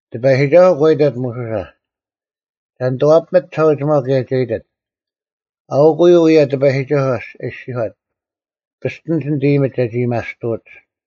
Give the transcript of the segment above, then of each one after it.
ᑎᐸᔨᒋᒐᓱᐤ ᒂ ᐃᑕᑦ ᒧᓱᓴ, ᒐ ᓂᑐᐛᐱᒥᑦ ᒋᓴᐅᒋᒪᐤ ᑭᔭ ᒐ ᐃᑎᑦ, “ᐊᐅᑯᐤ ᐅᔭ ᑎᐸᔨᒋᒐᓱᐤ ᐊ ᐃᔅᒋᔄᑦ: ‘ᐱᔅᑎᓂᒡ ᓂᑦ ᐃᔨᒥᒡ ᒐᒋ ᐊᔭᒥᐊᔅᑐᐅᒡ᙮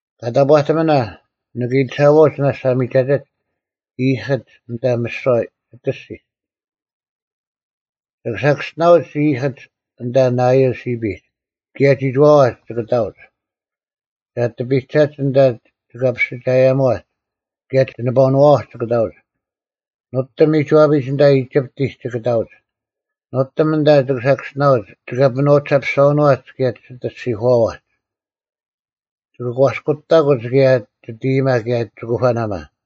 ᑲ ᑕᑈᑎᒥᓇ, ᓂᑭ ᐃᑎᓴᐛᐅᒡ ᓇᔅᒡ ᐊ ᒥᒐᑎᒡ ᐃᔨᑭᒡ ᐊᓐᑕ ᒥᓯᐛ ᒋᑦ ᐊᔅᒋᒡ᙮ ᒋᑭ ᓴᑭᔅᒋᓇᐅᒡ ᐃᔨᑭᒡ ᐊᓐᑕ ᓇᐃᔭᓪ ᓯᐱᒡ ᑭᔭ ᒋᒋᐛᐛᒡ ᒋᑭ ᑕᐅᒡ, ᒐ ᐊᑎ ᐱᒐᒡ ᐊᓐᑕ ᒋᑲᐱᔅᒋᒐᔭᒧᐛᒡ ᑭᔭ ᒋᓂᐸᐅᓄᐛᐛᒡ ᒋᑭ ᑕᐅᒡ! ᓄᑎᒻ ᒥᒋᐛᐱᒡ ᐊᓐᑕ ᐃᒋᑉᑎᒡ ᒋᑭ ᑕᐅᒡ᙮ ᓄᑎᒻ ᐊᓐᑕ ᒋᑭ ᓴᑭᔅᒋᓇᐅᒡ ᒋᑲᐱᒥᓄᐛᐤ ᒋᓴᐱᔅᒐᐛᓄᐛᒡ ᑭᔭ ᒋᑦ ᐊᔅᒋᐧᑯᐛᐛᒡ᙮ ᒋᑭ ᒂᔅᑯᑕᑯᒡ ᑭᔭ ᒋᑦ ᐃᔨᒪ ᑭᔭ ᒋᑯᐸᓇᒪ᙮’”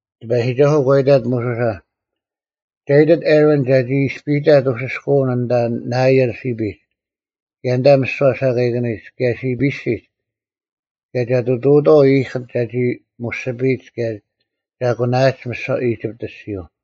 ᑎᐸᔨᒋᒐᓱᐤ ᒂ ᐃᑕᑦ ᒧᓱᓴ, “ᒐ ᐃᑎᑦ ᐊᕋᓐ ᒐᒋ ᐃᔅᐱᔨᑕᑦ ᐅᓯᔅᑲᐅᓐ ᐊᓐᑕ ᓇᐃᔭᓪ ᓯᐱᒡ ᑭᔭ ᐊᓐᑕ ᒥᓯᐛ ᓴᑲᐃᑭᓂᒡ ᑭᔭ ᓯᐱᓯᒡ ᑭᔭ ᒐ ᑐᑐᐅᑥᐤ ᐃᔨᑭᒡ ᒐᒋ ᒧᔅᒋᐱᔨᒡ ᑭᔭ ᒐ ᐊᑯᓇᐊᒡ ᒥᓯᐛ ᐃᒋᑉᑦ ᐊᔅᒋᔪᐤ᙮”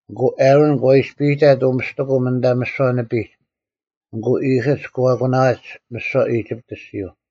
ᐊᑯ ᐊᕋᓐ ᒂ ᐃᔅᐱᔨᑕᑦ ᐅᒥᔅᑎᑯᒻ ᐊᓐᑕ ᒥᓯᐛ ᓂᐱᒡ ᐊᑯ ᐃᔨᑭᒡ ᒂ ᐊᑯᓇᐊᒡ ᒥᓯᐛ ᐃᒋᑉᑦ ᐊᔅᒋᔪᐤ᙮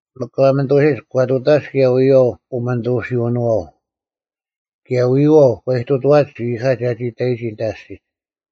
ᒥᒄ ᑲᒥᓂᑐᐅᓯᒡ ᒂ ᑐᑕᒡ ᑭᔭ ᐎᔪᐛᐤ ᐅᒥᓂᑐᓯᐅᓄᐛᐤ, ᑭᔭ ᐎᔪᐛᐤ ᒂ ᐃᑐᑐᐛᒡ ᐃᔨᑲ ᒐᒋ ᑕᔨᒋ ᐊᓐᑕ ᐊᔅᒋᒡ᙮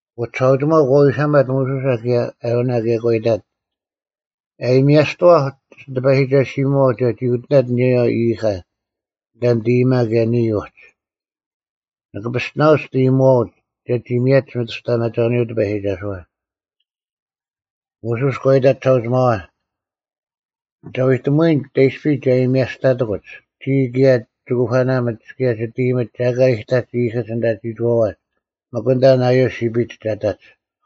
ᐊᑯ ᒋᓴᐅᒋᒪᐤ ᒂ ᐎᓴᒪᑦ ᒧᓱᓴ ᑭᔭ ᐊᕋᓇ ᑭᔭ ᒂ ᐃᑕᑦ, “ᐊᔭᒥᐊᔅᑐᐛᐧᒄ ᒋ ᑎᐸᔨᒋᒐᓯᒧᐛᐤ ᒐᒋ ᐅᑎᓇᑦ ᐊᓂᔭᔪᐛ ᐃᔨᑲ ᐊᓐᑕ ᓂᑦ ᐃᔨᒪ ᑭᔭ ᓂᔾ ᐅᒡ, ᓂᑭ ᐱᔅᑎᓇᐅᒡ ᒋᑦ ᐃᔨᒧᐛᐅᒡ ᒐᒋ ᒥᔭᒡ ᒥᑐᔅᑕᐊᒪᒐᐅᓂᔪᐤ ᑎᐸᔨᒋᒐᓱᐛ᙮” ᒧᓱᔅ ᒂ ᐃᑕᑦ ᒋᓴᐅᒋᒪᐛ, “ᒐ ᐎᑎᒧᐎᓐ ᑕᐃᔅᐱ ᒐ ᐊᔭᒥᐊᔅᑕᑎᑯᒡ, ᒋᔾ ᑭᔭ ᒋᑯᐸᓇᒥᒡ ᑭᔭ ᒋᑦ ᐃᔨᒥᒡ ᒐ ᐊᑲ ᐃᑕᒡ ᐃᔨᑭᒡ ᐊᓐᑕ ᒋᒋᐛᐛᒡ ᒥᒄ ᐊᓐᑕ ᓇᐃᔭᓪ ᓯᐱᒡ ᒐ ᑕᒡ᙮”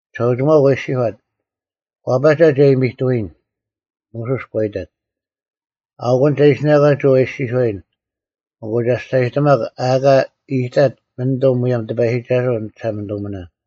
ᒋᓴᐅᒋᒪᐤ ᒂ ᐃᔅᒋᔄᑦ, “ᐛᐸᒐ ᒐ ᐃᔨᒥᑐᐎᓐ᙮” ᒧᓱᔅ ᒂ ᐃᑕᑦ, “ᐊᐅᑯᐤ ᒐ ᐃᓯᓇᒂᒡ ᐅ ᐊ ᐃᔅᒋᔄᔨᓐ ᐊᑯ ᒐ ᒋᔅᒐᔨᑎᒪᒄ ᐊ ᐊᑲ ᐃᔨᑕᑦ ᒪᓂᑐᐤ ᒧᔭᒻ ᑎᐸᔨᒋᒐᓱᐤ ᓂ ᒋᓴᒪᓂᑐᒥᓇᓐ᙮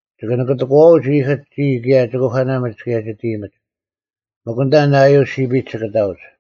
ᒋᑭ ᓂᑭᑎᑯᐛᐅᒡ ᐃᔨᑭᒡ ᒋᔾ ᑭᔭ ᒋᑯᐸᓇᒥᒡ ᑭᔭ ᒋᑦ ᐃᔨᒥᒡ᙮ ᒥᒄ ᐊᓐᑕ ᓇᐃᔭᓪ ᓯᐱᒡ ᒋᑭ ᑕᐅᒡ᙮”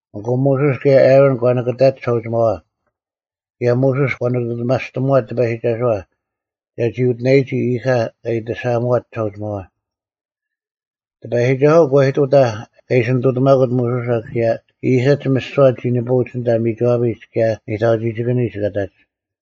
ᐊᑯ ᒧᓱᔅ ᑭᔭ ᐊᕋᓐ ᒂ ᓂᑭᑕᒡ ᒋᓴᐅᒋᒪᐛ, ᑭᔭ ᒧᓱᔅ ᒂ ᓂᑐᑎᒪᔅᑎᒧᐛᑦ ᑎᐸᔨᒋᒐᓱᐛ ᒐᒋ ᐅᑎᓇᔨᒋ ᐃᔨᑲ ᑲ ᐃᑎᓴᐊᒧᐛᑦ ᒋᓴᐅᒋᒪᐛ᙮ ᑎᐸᔨᒋᒐᓱᐤ ᒂ ᐃᑐᑕᐧᒃ ᑲ ᐃᓯ ᓂᑐᑎᒪᑯᑦ ᒧᓱᓴ ᑭᔭ ᐃᔨᑭᒡ ᒥᓯᐛ ᒋ ᓂᐳᐅᒡ ᐊᓐᑕ ᒥᒋᐛᐱᒡ ᑭᔭ ᓂᑕᐅᒋᒋᑭᓂᒡ ᑲ ᑕᒡ᙮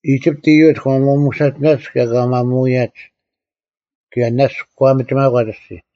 ᐃᒋᑉᑦ ᐃᔪᒡ ᒂ ᒪᒧᓴᒋᓇᒡ ᑭᔭ ᒂ ᒪᒧᐊᔭᒡ, ᑭᔭ ᓇᔅᒡ ᒂ ᒥᒋᒪᒂᒡ ᐊᔅᒋᔾ᙮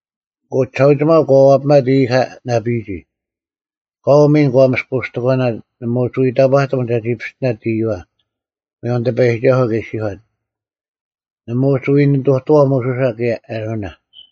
ᐊᑯ ᒋᓴᐅᒋᒪᐤ ᒂ ᐛᐱᒪᑦ ᐃᔨᑲ ᓇᐱᔨᒋ, ᑲᐤ ᒥᓐ ᒂ ᒥᔅᑯᔅᑎᒂᓇᑦ ᓇᒪ ᐅᒋ ᐎ ᑕᑈᑎᒻ ᒐᒋ ᐱᔅᑎᓇᑦ ᐃᔪᐛ, ᒧᔭᒻ ᑎᐸᔨᒋᒐᓱᐤ ᑲ ᐃᔅᒋᔄᑦ, ᓇᒪ ᐅᒋ ᐎ ᓂᑐᑐᐛᐤ ᒧᓱᓴ ᑭᔭ ᐊᕋᓇ᙮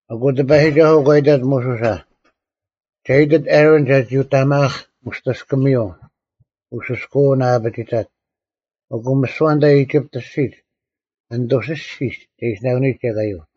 ᐊᑯ ᑎᐸᔨᒋᒐᓱᐤ ᒂ ᐃᑕᑦ ᒧᓱᓴ, “ᒐ ᐃᑎᑦ ᐊᕋᓐ ᒐᒋ ᐅᑕᒪᐊᒃ ᒧᔅᑎᔅᑭᒥᔪᐤ ᐅᓯᔅᑲᐅᓐ ᐊ ᐊᐱᒋᑕᑦ, ᐊᑯ ᒥᓯᐛ ᐊᓐᑕ ᐃᒋᑉᑦ ᐊᔅᒋᒡ ᒥᓐᑐᓯᓯᒡ ᒐ ᐃᓯᓇᑯᓂᔨᒡ ᐃᔭᑲᔪᐤ᙮”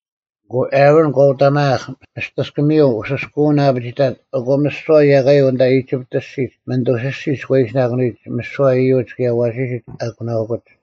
ᐊᑯ ᐊᕋᓐ ᒂ ᐅᑕᒪᐊᐧᒃ ᒧᔅᑎᔅᑭᒥᔪᐤ ᐅᓯᔅᑲᐅᓐ ᐊ ᐊᐱᒋᑕᑦ ᐊᑯ ᒥᓯᐛ ᐃᔭᑲᔪᐤ ᐊᓐᑕ ᐃᒋᑉᑦ ᐊᔅᒋᒡ ᒥᓐᑐᓯᓯᒡ ᒂ ᐃᓯᓂᑯᓂᔨᒡ ᒥᓯᐛ ᐃᔪᒡ ᑭᔭ ᐊᐛᓯᓯᒡ ᐊᑯᓇᐅᑯᒡ᙮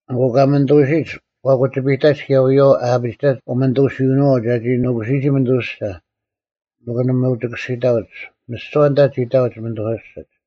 ᐊᑯ ᑲᒥᓂᑐᐅᓯᒡ ᑲ ᑯᒋᐱᑕᒡ ᑭᔭ ᐎᔪᐛᐤ ᐊ ᐊᐱᒋᑕᒡ ᐅᒥᓂᑐᓯᐅᓄᐛᐤ ᒐᒋ ᓄᑯᓯᔨᒋ ᒥᓐᑐᓯᓴ ᒥᒄ ᓇᒪ ᐅᒋ ᑭᔅᒋᑕᐅᒡ, ᒥᓯᐛ ᐊᓐᑕ ᒋ ᑕᐅᒡ ᒥᓐᑐᓯᓯᒡ᙮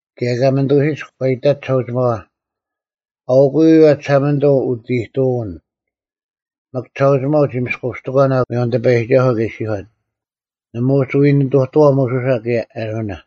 ᑭᔭ ᑲᒥᓂᑐᐅᓯᒡ ᒂ ᐃᑕᒡ ᒋᓴᐅᒋᒪᐛ, “ᐊᐅᑯᔪᐤ ᐅᔭ ᒋᓴᒪᓂᑐᐤ ᐅᑦ ᐃᑐᐅᓐ᙮” ᒥᒄ ᒋᓴᐅᒋᒪᐤ ᒋ ᒥᔅᑯᔅᑎᒂᓇᐤ, ᒧᔭᒻ ᑎᐸᔨᒋᒐᓱᐤ ᑲ ᐃᔅᒋᔄᑦ, ᓇᒪ ᐅᒋ ᐎ ᓂᑐᑐᐛᐤ ᒧᓱᓴ ᑭᔭ ᐊᕋᓇ᙮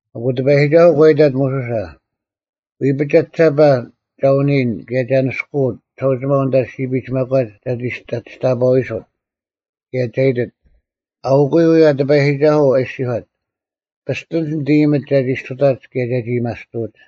ᐊᑯ ᑎᐸᔨᒋᒐᓱᐤ ᒂ ᐃᑕᑦ ᒧᓱᓴ, “ᐎᐱᒡ ᒐᒋᓴᐸ ᒐ ᐅᓂᔨᓐ ᑭᔭ ᒐ ᓂᔅᑯᐅᑦ ᒋᓴᐅᒋᒪᐤ ᐊᓐᑕ ᓯᐱᒡ ᒪᒂᒡ ᒐ ᒋᔅᑕᐸᐅᐎᓱᑦ, ᑭᔭ ᒐ ᐃᑎᑦ, ‘ᐊᐅᑯᔪᐤ ᐅᔭ ᑎᐸᔨᒋᒐᓱᐤ ᐊ ᐃᔅᒋᔄᑦ: ᐱᔅᑎᓂᒡ ᓂᑦ ᐃᔨᒥᒡ ᒐᒋ ᔅᑐᑕᒡ ᑭᔭ ᒐᒋ ᐊᔭᒥᐊᔅᑐᐅᒡ᙮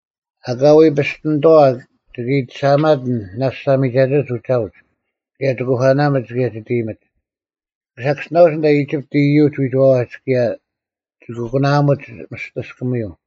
ᐊᑲ ᐎ ᐱᔅᑎᓂᑥᐛ ᒋᑭ ᐃᑎᓴᐊᒪᑎᓐ ᓇᔅᒡ ᐊ ᒥᒐᑎᒡ ᐅᒐᐅᒡ ᑭᔭ ᒋᑯᐸᓇᒥᒡ ᑭᔭ ᒋᑦ ᐃᔨᒥᒡ᙮ ᒋᑭ ᓴᑭᔅᒋᓇᐅᒡ ᐊᓐᑕ ᐃᒋᑉᑦ ᐃᔪᒡ ᐎᒋᐛᐛᒡ ᑭᔭ ᒋᑭ ᑯᓇᐊᒧᒡ ᒧᔅᑎᔅᑭᒥᔪᐤ᙮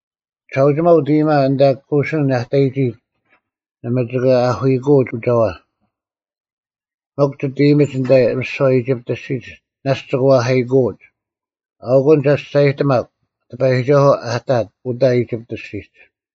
ᒋᓴᒪᓂᑐᐤ ᐅᑦ ᐃᔨᒪ ᐊᓐᑕ ᑯᓯᓐ ᐊ ᑕᔨᒋ ᓇᒪ ᒋᑭ ᐛᐧᑲᐃᑯᐅᒡ ᐅᒐᐛ, ᒥᒄ ᒋᑦ ᐃᔨᒥᒡ ᐊᓐᑕ ᒥᓯᐛ ᐃᒋᑉᑦ ᐊᔅᒋᒡ ᓇᔅᒡ ᒋᑭ ᐛᐧᑲᐃᑯᐅᒡ᙮ ᐊᐅᑯᓐ ᒐ ᒋᔅᒐᔨᑎᒪᒃ ᑎᐸᔨᒋᒐᓱᐤ ᐊᑕᑦ ᐅᑕ ᐃᒋᑉᑦ ᐊᔅᒋᒡ᙮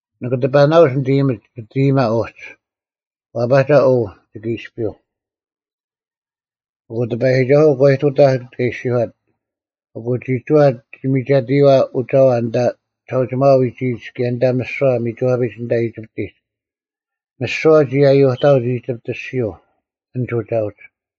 ᓂᑭ ᑎᐸᓇᐅᒡ ᓂᑦ ᐃᔨᒥᒡ ᒋᑦ ᐃᔨᒪ ᐅᒡ, ᐛᐸᒐ ᐅ ᒋᑭ ᐃᔅᐱᔪᐤ᙮’” ᑭᔭ ᑎᐸᔨᒋᒐᓱᐤ ᒂ ᐃᑐᑕᐧᒃ ᑲ ᐃᔅᒋᔄᑦ, ᐊᑯ ᒋᒋᐛ ᒋ ᒥᒐᑎᔪᐛ ᐅᒐᐛ ᐊᓐᑕ ᒋᓴᐅᒋᒪᐛ ᐎᒋᔨᒡ ᑭᔭ ᐊᓐᑕ ᒥᓯᐛ ᒥᒋᐛᐱᒡ ᐊᓐᑕ ᐃᒋᑉᑎᒡ᙮ ᒥᓯᐛ ᒋ ᐃᔭᔪᑕᐅᒡ ᐃᒋᑉᑦ ᐊᔅᒋᔪᐤ ᐊᓐᒡ ᐅᒐᐅᒡ᙮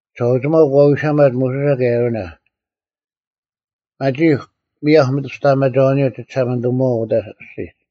ᒋᓴᐅᒋᒪᐤ ᒂ ᐎᓴᒪᑦ ᒧᓱᓴ ᑭᔭ ᐊᕋᓇ, “ᒪᒋᒄ ᒥᔭᐧᒄ ᒥᑐᔅᑕᐊᒪᒐᐅᓂᔪᐤ ᒋᒋᓴᒪᓂᑐᒧᐛᐤ ᐅᑕ ᐊᔅᒋᒡ᙮”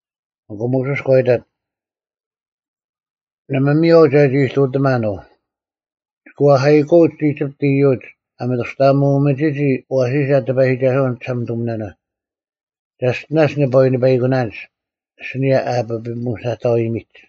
ᐊᑯ ᒧᓱᔅ ᒂ ᐃᑕᑦ, “ᓇᒪ ᒥᔽᐤ ᒐᒋ ᐃᑐᑎᒪᓐ ᐅ᙮ ᒋᑭ ᐛᐧᑲᐃᑯᐅᒡ ᐃᒋᑉᑦ ᐃᔪᒡ ᐊ ᒥᑐᔅᑕᐊᒧᒥᒋᒋ ᐊᐛᓯᓴ ᑎᐸᔨᒋᒐᓱᐛ ᓂᒋᓴᒪᓂᑐᒥᓇᓇ᙮ ᒐᔅᑎᓇᔅ ᓂᐸ ᐎ ᓂᐸᐃᑯᓇᓐᒡ ᐊᓯᓂᔭ ᐊ ᐸᐱᒧᓯᓇᑕᐎᒥᒡ᙮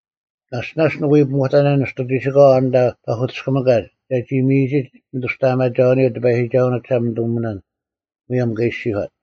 ᐛᔅ ᓇᔅᒡ ᓂᑭ ᐎ ᐱᒧᑕᓇᓐ ᓂᔅᑐ ᒋᓯᑲᐛ ᐊᓐᑕ ᐸᐧᑯᑎᔅᑭᒥᑲᒡ ᒐᒋ ᒥᔨᒋᒡ ᒥᑐᔅᑕᐊᒪᒐᐅᓂᔪᐤ ᑎᐸᔨᒋᒐᓱᐤ ᓂᒋᓴᒪᓂᑐᒥᓇᓐ, ᒧᔭᒻ ᑲ ᐃᔅᒋᔄᑦ᙮”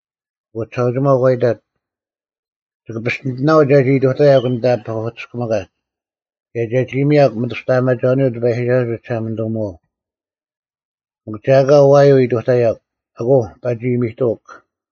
ᐊᑯ ᒋᓴᐅᒋᒪᐤ ᒂ ᐃᑕᑦ, “ᒋᑭ ᐱᔅᑎᓂᑎᓇᐤ ᒐᒋ ᐃᑐᑕᔭᒃ ᐊᓐᑕ ᐸᐧᑯᑎᔅᑭᒥᑲᒡ ᑭᔭ ᒐᒋ ᒥᔭᒄ ᒥᑐᔅᑕᐊᒪᒐᐅᓂᔪᐤ ᑎᐸᔨᒋᒐᓱᐤ ᒋᒋᓴᒪᓂᑐᒧᐛᐤ, ᒥᒄ ᒐ ᐊᑲ ᐛᔪᐤ ᐃᑐᑕᔭᒄ ᐊᑯ ᐸᒋ ᐃᔨᒥᑐᐅᒄ᙮”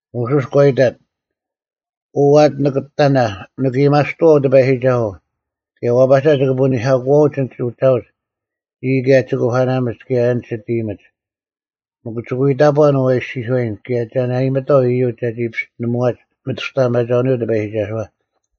ᒧᓱᔅ ᒂ ᐃᑕᑦ, “ᐅ ᐊᑎ ᓂᑭᑕᓇ, ᓂᑭ ᐊᔭᒥᐊᔅᑐᐛᐤ ᑎᐸᔨᒋᒐᓱᐤ, ᑭᔭ ᐛᐸᒐ ᒋᑭ ᐳᓂᐧᑲᑯᐛᐅᒡ ᐊᓐᒡ ᐅᒐᐅᒡ ᒋᔾ ᑭᔭ ᒋ ᑯᐸᓇᒥᒡ ᑭᔭ ᐊᓐᒡ ᒋᑦ ᐃᔨᒥᒡ᙮ ᒥᒄ ᒋᑭ ᐎ ᑕᑈᓐ ᐅ ᐊ ᐃᔅᒋᔄᔨᓐ ᑭᔭ ᒐ ᓇᐃᒥᑥᐤ ᐃᔪᒡ ᒐᒋ ᐱᔅᑎᓂᒧᐛᒡ ᒥᑐᔅᑕᐊᒪᒐᐅᓂᔪᐤ ᑎᐸᔨᒋᒐᓱᐛ᙮”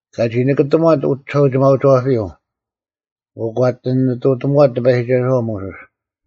ᑲᒋ ᓂᑭᑎᒺᑦ ᐅᒋᓴᐅᒋᒪᐅᒋᐛᐱᔪᐤ, ᐊᑯ ᒂ ᐊᑎ ᓂᑐᑎᒧᐛᑦ ᑎᐸᔨᒋᒐᓱᐛ ᒧᓱᔅ,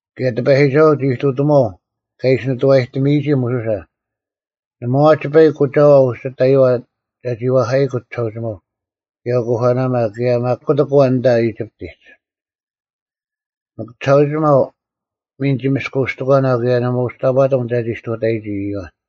ᑭᔭ ᑎᐸᔨᒋᒐᓱᐤ ᒋ ᐃᑐᑎᒺᐤ ᑲ ᐃᓯ ᓂᑐᐛᔨᑎᒥᔨᒋ ᒧᓱᓴ᙮ ᓇᒪ ᐛᐛᒡ ᐸᐃᒄ ᐅᒐᐛ ᐅᒋ ᑕᔪᐛ ᒐᒋ ᐅᐧᑲᐃᑯᑦ ᒋᓴᐅᒋᒪᐤ, ᑭᔭ ᐅᑯᐸᓇᒪ, ᑭᔭ ᒪᒃ ᑯᑎᒃ ᐊᐛᓐ ᐊᓐᑕ ᐃᒋᑉᑎᒡ᙮ ᒥᒄ ᒋᓴᐅᒋᒪᐤ ᒥᓐ ᒋ ᒥᔅᑯᔅᑎᒂᓇᐤ ᑭᔭ ᓇᒪ ᐅᒋ ᑕᑈᑎᒻ ᒐᒋ ᔅᑐᑕᔨᒋ ᐊᓂᔭ ᐃᔪᐛ᙮